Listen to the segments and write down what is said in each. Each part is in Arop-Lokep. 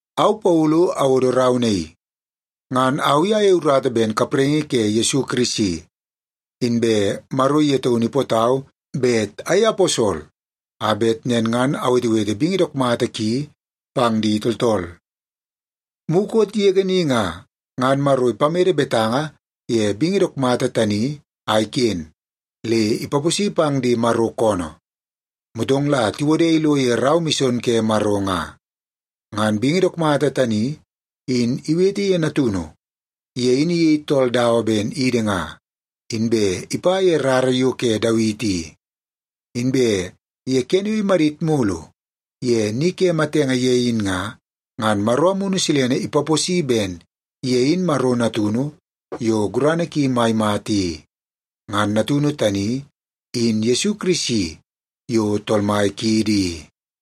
Au Paulu awodo rau naii. Ngan au i ayei urata ben kapraingi ke Yesu Kirisi, inbe Maro ye taunu ipootau bet ayei aposol a bet nen ngan awetewete bingi dook mata ki pang di tooltool. Mukot yege ni nga, ngan Maro ipamede betanga ye bingi dook mata tani a iken, le ipaposi pang di Maro koonoo, motong la tiwode ilo ye rau mison ke Maro nga. Ngan bingi dook mata tani in iwete ye Natunu. Ye in iyei tool dawa ben idi nga, inbe ipa ye rara yo ke Dawiti i. Inbe ye kene yo imadit mulu ye ni ke matenge ye in nga, ngan Maro Amunu Silene ipaposi ben ye in Maro Natunu yo gurana ki mai mata i. Ngan Natunu tani in Yesu Kirisi yo Tool Mai kiidi i.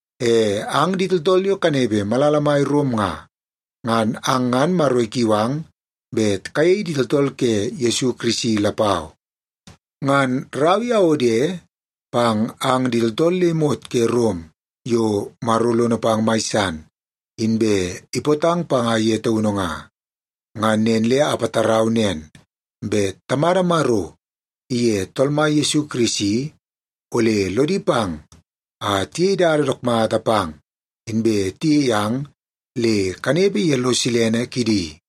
E ang di tooltool yo kanepe malala mai Rom nga, ngan ang ngan Maro ikiu ang bet kayei di tooltool ke Yesu Kirisi lapau. Ngan rau i awode pang ang di tooltool le imot ke Rom yo Maro lono pang mai san, inbe ipootang panga ye taunu nga. Ngan nen le apatarau nen, bet Tamada Maro iye Tool Mai Yesu Kirisi ole lodi pang a tiyei dada dook mata pang, inbe tiyei ang le kanepe ye lo silene kidi.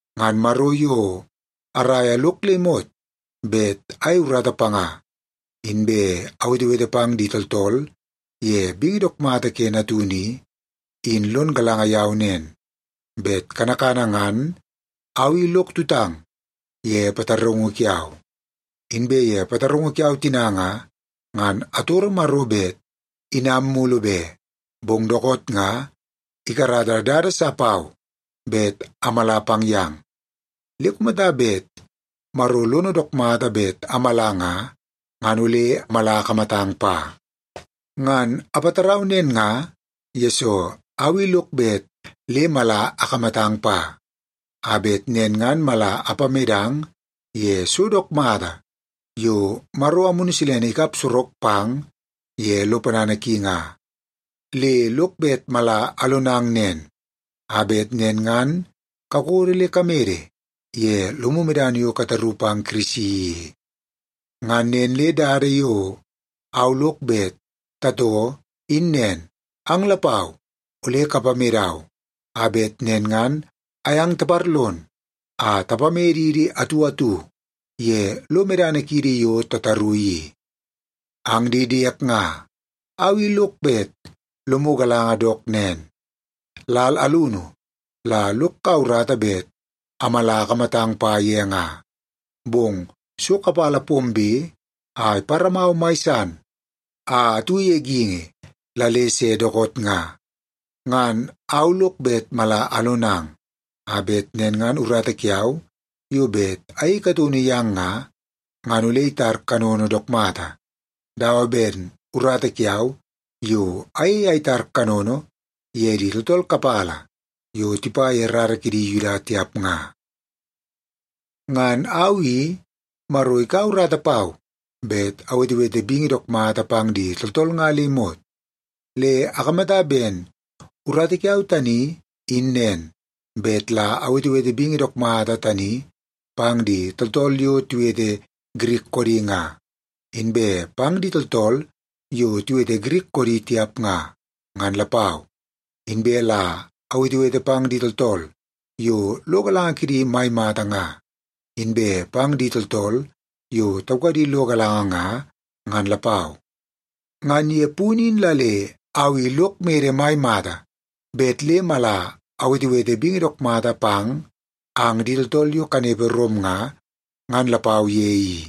Ngan Maro yo araia lok le imot bet ayei urata panga inbe awetewete pang di tooltool ye bingi dook mata ke Natunu i, in lon galanga yau nen, bet kanakana ngan au i lok tutang ye pataraungu kiau. Inbe ye pataraungu kiau tina nga, ngan atoro Maro bet anam mulu be, bong dookoot nga ikarata dada sa pau bet amala pang yang. Le kumata bet Maro lono dook mata bet amala nga, ngan ole mala akamatang pa. Ngan apatarau nen nga, yesoo au i lok bet le mala akamatang pa, a bet nen ngan mala apamedang ye so dook mata yo Maro Amunu Silene ikap sorok pang ye lo ponana ki nga. Le lok bet mala alonang nen, a bet nen ngan kakodo le kamede ye lomu medana yo kataru pang Kirisi i. Ngan nen le dada yo au lok bet tatoo in nen, ang lapau ole kapamedau, a bet nen ngan ayang taparlon a tapamedidi atu atu ye lo medana kiidi yo tataru i. Ang di diek nga, au i lok bet lomu galanga dook nen, lal alunu la lok kaua urata bet amala akamatang pa ye nga, bong so kapala pombe a iparamau mai san a atu ye geingi la le se dookoot nga. Ngan au lok bet mala alonang, a bet nen ngan urata kiau yo bet ayei kataunu yang nga, ngan ole itar kanono dook mata, dawa ben urata kiau yo ayei a itar kanono ye di tooltool kapala yo tipa ye rara kidi Yuda tiap nga. Ngan au i, Maro ikaua urata pau bet awetewete bingi dook mata pang di tooltool nga le imot. Le akamata ben urata kiau tani in nen, bet la awetewete bingi dook mata tani pang di tooltool yo tiwete Girik koodi nga, inbe pang di tooltool yo tiwete Girik koodi tiap nga, ngan lapau. Inbe la awetewete pang di tooltool yo lo galanga kidi mai mata nga, inbe pang di tooltool yo taukadi lo galanga nga, ngan lapau. Ngan ye punu in la le au i lok mede mai mata bet le mala awetewete bingi dook mata pang ang di tooltool yo kanepe Rom nga, ngan lapau ye i.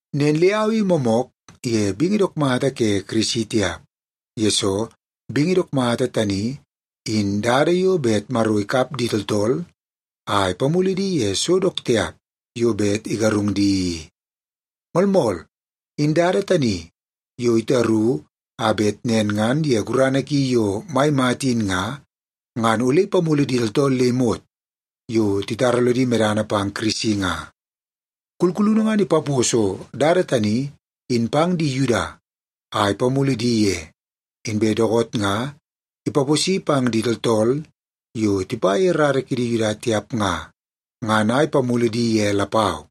Nen le au i moomook ye bingi dook mata ke Kirisi tiap, yesoo bingi dook mata tani in dada yo bet Maro ikap di tooltool a ipamulu di ye so dook tiap yo bet igarung di i. Moolmool, in dada tani yo itaru a bet nen ngan ye gurana ki yo mai mata in nga, ngan ole ipamulu di tooltool le imot yo titara lodi medana pang Kirisi nga. Kulkulunu ngan ipaposo dada tani in pang di Yuda a ipamulu di ye, inbe dookoot nga ipaposi pang di tooltool yo tipa ye rara kidi Yuda tiap nga, ngan a ipamulu di ye lapau.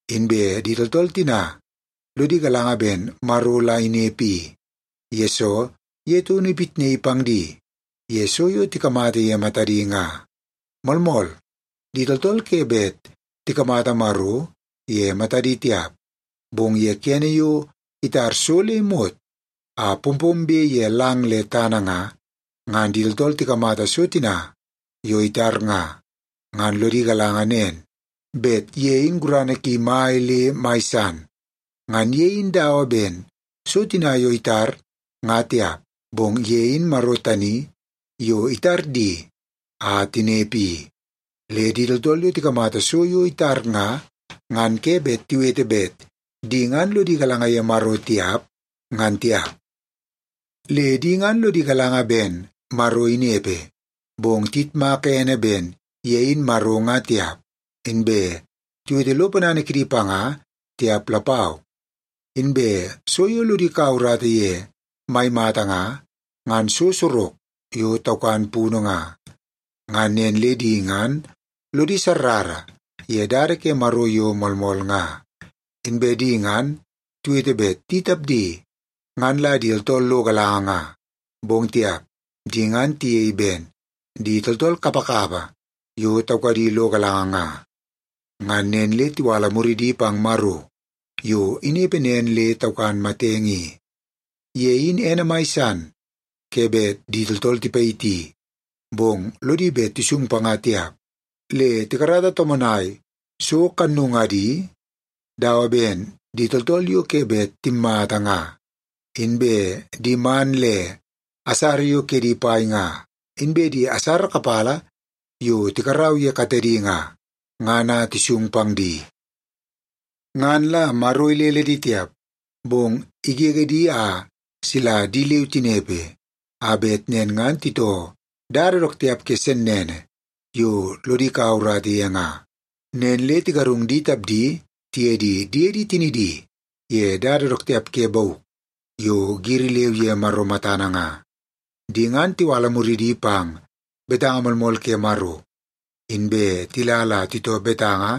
Inbe di tooltool tina lodi galanga ben Maro la inepe i, yesoo ye taunu ipitnaii pang di ye so yo tikamata ye matadi nga. Moolmool, di tooltool ke bet tikamata Maro ye matadi tiap, bong ye kene yo itar so le imot a pompombe ye lang le tana nga, ngan di tooltool tikamata so tina yo itar nga, ngan lodi galanga nen, bet ye in gurana ki mai le mai san. Ngan ye in dawa ben so tina yo itar nga tiap, bong ye in Maro tani yo itar di a tinepe i. Le di tooltool yo tikamata so yo itar nga, ngan ke bet tiwete bet di ngan lodi galanga ye Maro tiap, ngan tiap. Le di ngan lodi galanga ben Maro inepe, bong tiyitmaka ene ben ye in Maro nga tiap, inbe tiwete lo ponana kidi panga tiap lapau. Inbe so yo lodi kaua urata ye mai mata nga, ngan so sorok yo taukan punu nga. Ngan nen le di ngan lodi sarrara ye dada ke Maro yo moolmool nga. Inbe di ngan tiwete bet di tapdi ngan la di tooltool lo galanga nga, bong tiap, di ngan tiyei ben di tooltool kapakapa yo taukadi lo galanga nga. Ngan nen le tiwala muridi pang Maro yo inepe nen le taukan matenge i. Ye in ene mai san ke bet di tooltool tipayiti, bong lodi bet tisung panga tiap, le tikarata tomonai so kannungadi dawa ben di tooltool yo ke bet timmata nga, inbe di man le asara yo kedi pai nga, inbe di asara kapala yo tikarau ye katedi nga, ngan a tisung pang di. Ngan la Maro ilele di tiap, bong igege di a sila di leu tinepe, a bet nen ngan titoo dada dook tiap ke sennene yo lodi kaua urata ye nga. Nen le tigarung di tapdi tiye di diedi tinidi ye dada dook tiap ke bauk yo giri leu ye Maro matana nga. Di ngan tiwala muridi pang betanga moolmool ke Maro, inbe tila la titoo betanga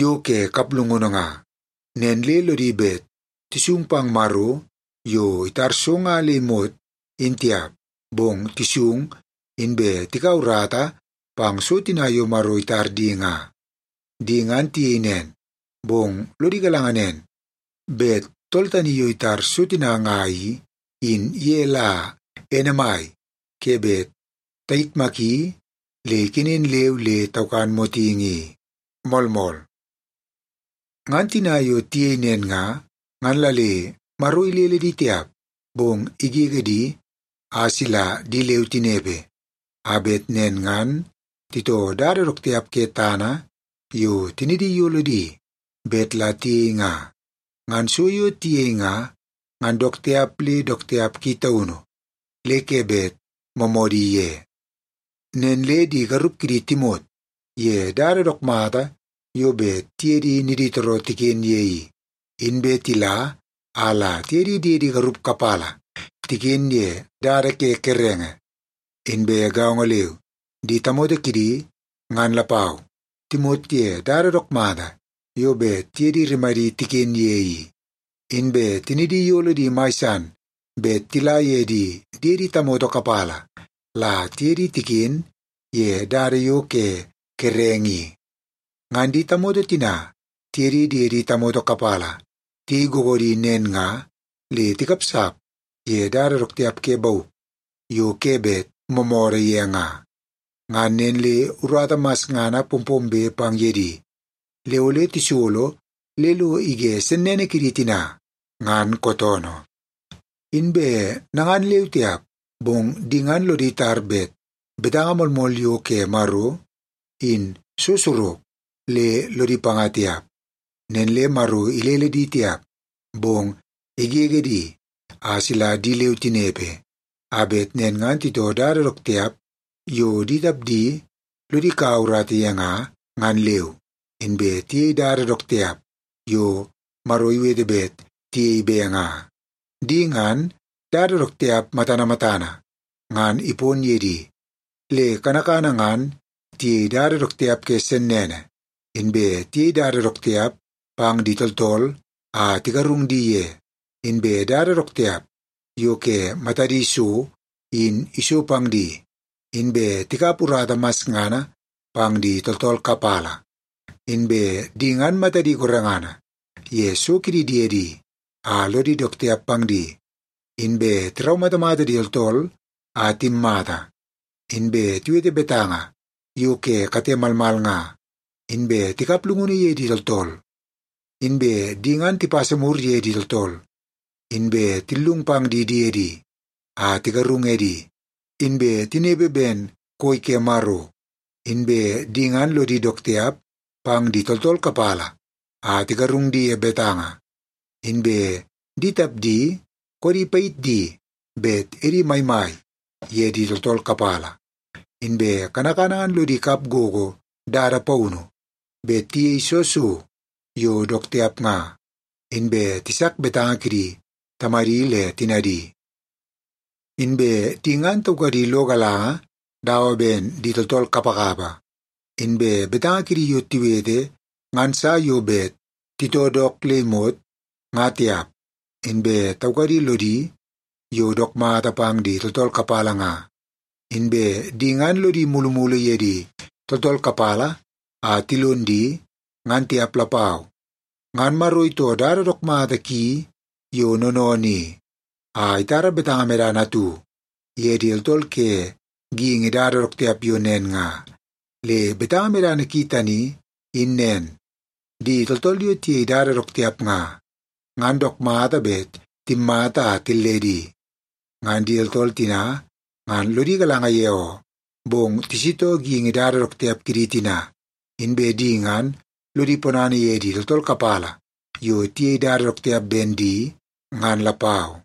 yo ke kaplungunu nga. Nen le lodi bet tisung pang Maro yo itar so nga le imot, in tiap, bong tisung inbe tikau urata pang so tina yo Maro itar di nga. Di ngan tiyei nen, bong lod galanga nen, bet tool tani yo itar so tina nga i, in ye la ene mai ke bet tayitmaki le ikenen leu le taukan motingi i. Moolmool. Ngan tina yo tiyei nen nga, ngan la le Maro ilele di tiap, bong igege di a sila di leu tinepe, a bet nen ngan titoo dada dook tiap ke tana yo tinidi iyolo di bet la tiyei nga. Ngan so yo tiyei nga, ngan dook tiap le dook tiap ki taunu le ke bet moomoodi ye. Nen le di garup kidi timot ye dada dook mata yo bet tiye di niditooroo tiken ye i, inbe tila a la tiye di diedi garup kapala tiken ye dada ke kerenge. Inbe gaongo leu, di tamoto kidi ngan lapau timot ye dada dook mata yo bet tiye di rimadi tiken ye i, inbe tinidi iyolo di mai san bet tila ye di diede tamoto kapala la tiye di tiken ye dada yo ke kerenge i. Ngan di tamoto tina tiye di diede tamoto kapala tiyei googoodi nen nga, le tikapsap ye dada dook tiap ke bauk yo ke bet moomoodoo ye nga. Ngan nen le urata masngana pompombe pang ye di, le ole tisolo le lo ige sennene kidi tina ngan kootoonoo. Inbe nangan leu tiap, bong di ngan lodi tar bet betanga moolmool yo ke Maro, in so sorok, le lodi panga tiap. Nen le Maro ilele di tiap, bong igege di a sila di leu tinepe, a bet nen ngan titoo dada dook tiap yo di tapdi lodi kaua urata ye nga, ngan leu, inbe tiyei dada dook tiap yo Maro iwete bet tiyei be nga. Di ngan, dada dook tiap matana matana ngan ipon ye di. Le kanakana ngan tiyei dada dook tiap ke sennene, inbe tiyei dada dook tiap pang di tooltool a tigarung di ye, inbe dada dook tiap yo ke matadi so in iso pang di, inbe tikap urata masngana pang di tooltool kapala. Inbe di ngan matadi gorengana ye so kidi diedi a lodi dook tiap pang di, inbe tiraumatamata di tooltool a timmata, inbe tiwete betanga yo ke kate malmal nga, inbe tikap llungunu ye di tooltool. Inbe di ngan tipasa mur ye di tooltool, inbe tillung pang di diedi a tigarung edi, inbe tinepe ben koi ke Maro, inbe di ngan lodi dook tiap pang di tooltool kapala a tigarung di ye betanga, inbe di tapdi koodi payit di bet edi maimai ye di tooltool kapala. Inbe kanakana ngan lodi kap gogo dada paunu bet tiyei soo so yo dook tiap nga, inbe tisak betanga kidi tamadi le tinadi. Inbe di ngan taukadi lo galanga dawa ben di tooltool kapakapa, inbe betanga kidi yo tiwete ngan sa yo bet titoo dook le imot nga tiap, inbe taukadi lodi yo dook mata pang di tooltool kapala nga, inbe di ngan lodi mulumulu ye di tooltool kapala a tilon di, ngan tiap lapau. Ngan Maro itoo dada dook mata ki yo noonoonoo i, a itara betanga medana atu ye di tooltool ke geingi dada dook tiap yo nen nga. Le betanga medana ki tani in nen, di tooltool yo tiyei dada dook tiap nga, ngan dook mata bet timmata a tilledi. Ngan di tooltool tina ngan lodi galanga ye oo, bong tisitoo geingi dada dook tiap kidi tina, inbe di ngan lodi ponana ye di tooltool kapala yo tiyei dada dook tiap ben di, ngan lapau.